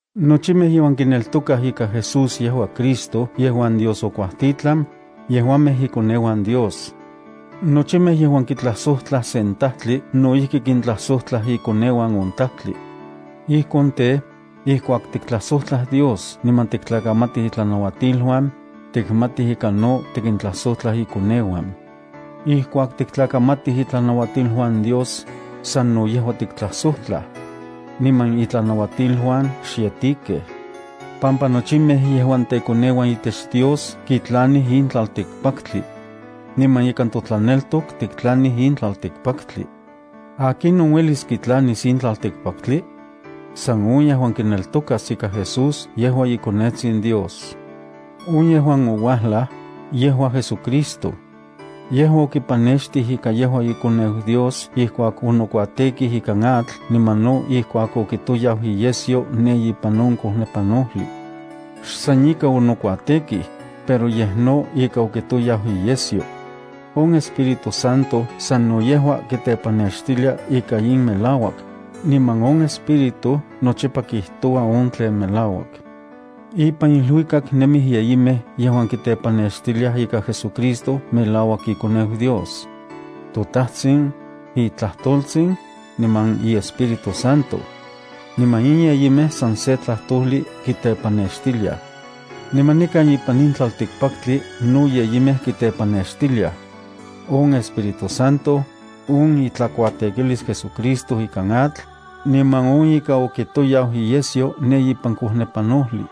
Nochimej yejuan kineltokaj ika Jesús yejua Cristo yejuan Dios okuatitlan, yejuamej ikoneuan Dios. Nochimej yejuan kitlajsojtlaj sen tajtli no ijki kintlajsojtlaj ikoneuan on tajtli. Ijkon tej, ijkuak tiktlajsojtlaj Dios niman tiktlakamatij itlanauatiluan, tikmatij ika no tikintlajsojtlaj ikoneuan. Ijkuak tiktlakamatij itlanauatiluan Dios, sano yejua tiktlajsojtlaj. Niman itlanauatiluan xyetikej, pampa nochimej yejuan tekoneuan itech Dios kitlanij in tlaltikpaktli. Niman ikan totlaneltok tiktlanij in tlaltikpaktli. ¿Akinon uelis kitlanis in tlaltikpaktli? San on yejuan kineltokas ika Jesús yejua iKonetsin Dios. On yejuan ouajlaj, yejua JesuCristo. Yejua okipanextij ika yejua iKoneu Dios ijkuak onokuatekij ikan atl niman no ijkuak okitoyau iyesyo ne ipan on kojnepanojli. Xsan ika onokuatekij, pero yej no ika okitoyau iyesyo. On Espíritu Santo sano yejua kitepannextilia ika in melauak, niman on Espíritu nochipa kijtoua on tlen melauak. Ipan iluikak nemij yeyimej yejuan kitepannextiliaj ika JesuCristo melauak iKoneu Dios: toTajtsin, iTlajtoltsin, niman iEspíritu Santo. Niman in yeyimej san se tlajtojli kitepannextiliaj. Niman nikan ipan in tlaltikpaktli no yeyimej kitepannextiliaj: on Espíritu Santo, on itlakuatekilis JesuCristo ikan atl, niman on ika okitoyau iyesyo ne ipan kojnepanojli.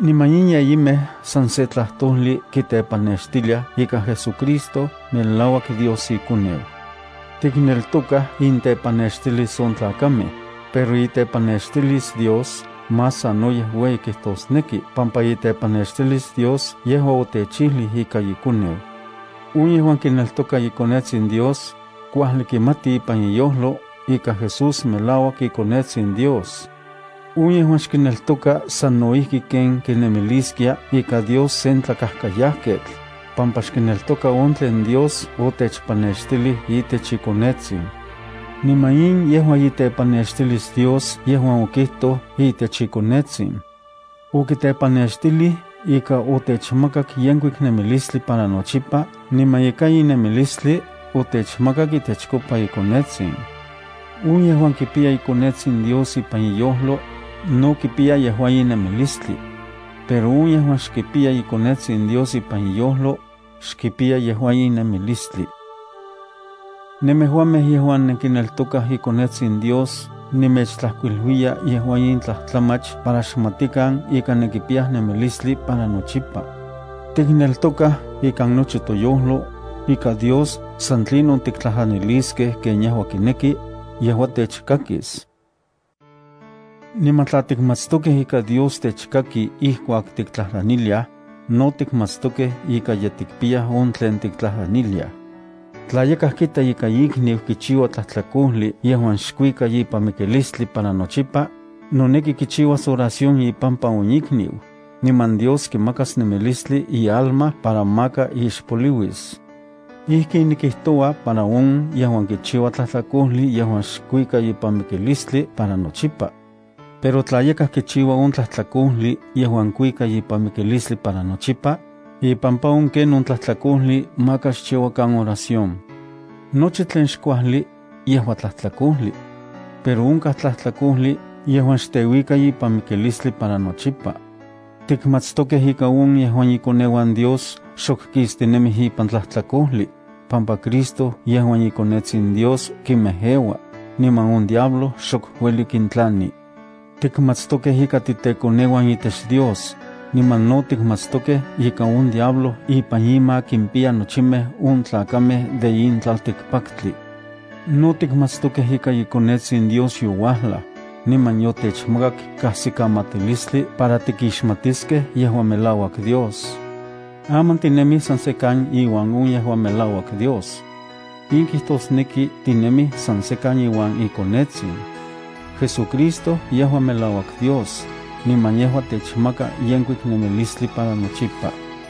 Niman in yeyimej san se tlajtojli kitepannextiliaj ika JesuCristo melauak Dios iKoneu. Tikneltokaj intepannextilis on tlakamej, pero itepannextilis Dios más sanoyej ueyi kijtosneki pampa itepannextilis Dios yejua otechijlij ika iKoneu. On yejuan kineltoka iKonetsin Dios, kuajli kimati ipan iyojlo ika Jesús melauak iKonetsin Dios. On yejuan xkineltoka sano ijki ken kinemiliskia ika Dios sen tlakajkayajketl, pampa xkineltoka on tlen Dios otechpannextilij itech iKonetsin. Niman in yejua itepannextilis Dios yejuan okijtoj itech iKonetsin. Okitepannextilij ika otechmakak yenkuik nemilistli para nochipa niman ika in nemilistli otechmakak itechkopa iKonetsin. On yejuan kipiya iKonetsin Dios ipan iyojlo, no kipiya yejua in nemilistli. Pero on yejuan xkipiya iKonetsin Dios ipan iyojlo, xkipiya yejua in nemilistli. Nemejuamej yejuan nenkineltokaj iKonetsin Dios nemechtlajkuiluiya yejua in tlajtlamach para xmatikan ika nenkipiyaj nemilistli para nochipa. Tikneltokaj ikan nochi toyojlo, ika Dios san tlinon tiktlajtlaniliskej ken yejua kineki, yejua techkakis. Niman tla tikmatstokej ika Dios techkaki ijkuak tiktlajtlaniliaj, no tikmatstokej ika ye tikpiyaj on tlen tiktlajtlaniliaj. Tla yakaj kita ika ikniu kichiua tlajtlakojli yejuan xkuika ipan mikilistli para nochipa, noneki kichiuas oración ipampa on ikniu, niman Dios kimakas nemilistli ialma para maka ixpoliuis. Ijkin nikijtoua para on yejuan kichiua tlajtlakojli yejuan xkuika ipan mikilistli para nochipa. Pero onkaj tlajtlakojli yejuan teuika ipan mikilistli para nochipa. Yejua on ken on xnemechijlia para ipampa xchiuakan oración. Nochi tlen xkuajli, yejua tlajtlakojli. Pero onkaj tlajtlakojli yejuan xteuika ipan mikilistli para nochipa. Tikmatstokej ika on yejuan ikoneuan Dios xok kistinemij ipan tlajtlakojli, pampa Cristo yejuan iKonetsin Dios kinmejeua, niman on diablo xok ueli kintlani. Tikmatstokej ika titekoneuan itech Dios, niman no tikmatstokej ika on diablo ipan ima kimpiya nochimej on tlakamej de in tlaltikpaktli. No tikmatstokej ika iKonetsin Dios youajlaj, niman yotechmakak kajsikamatilistli para tikixmatiskej yejuan melauak Dios. Aman tinemij san sekan iuan on yejuan melauak Dios. In kijtosneki tinemij san sekan iuan iKonetsin. JesuCristo yejua melauak Dios, niman yejua techmaka yenkuik nemilistli para nochipa.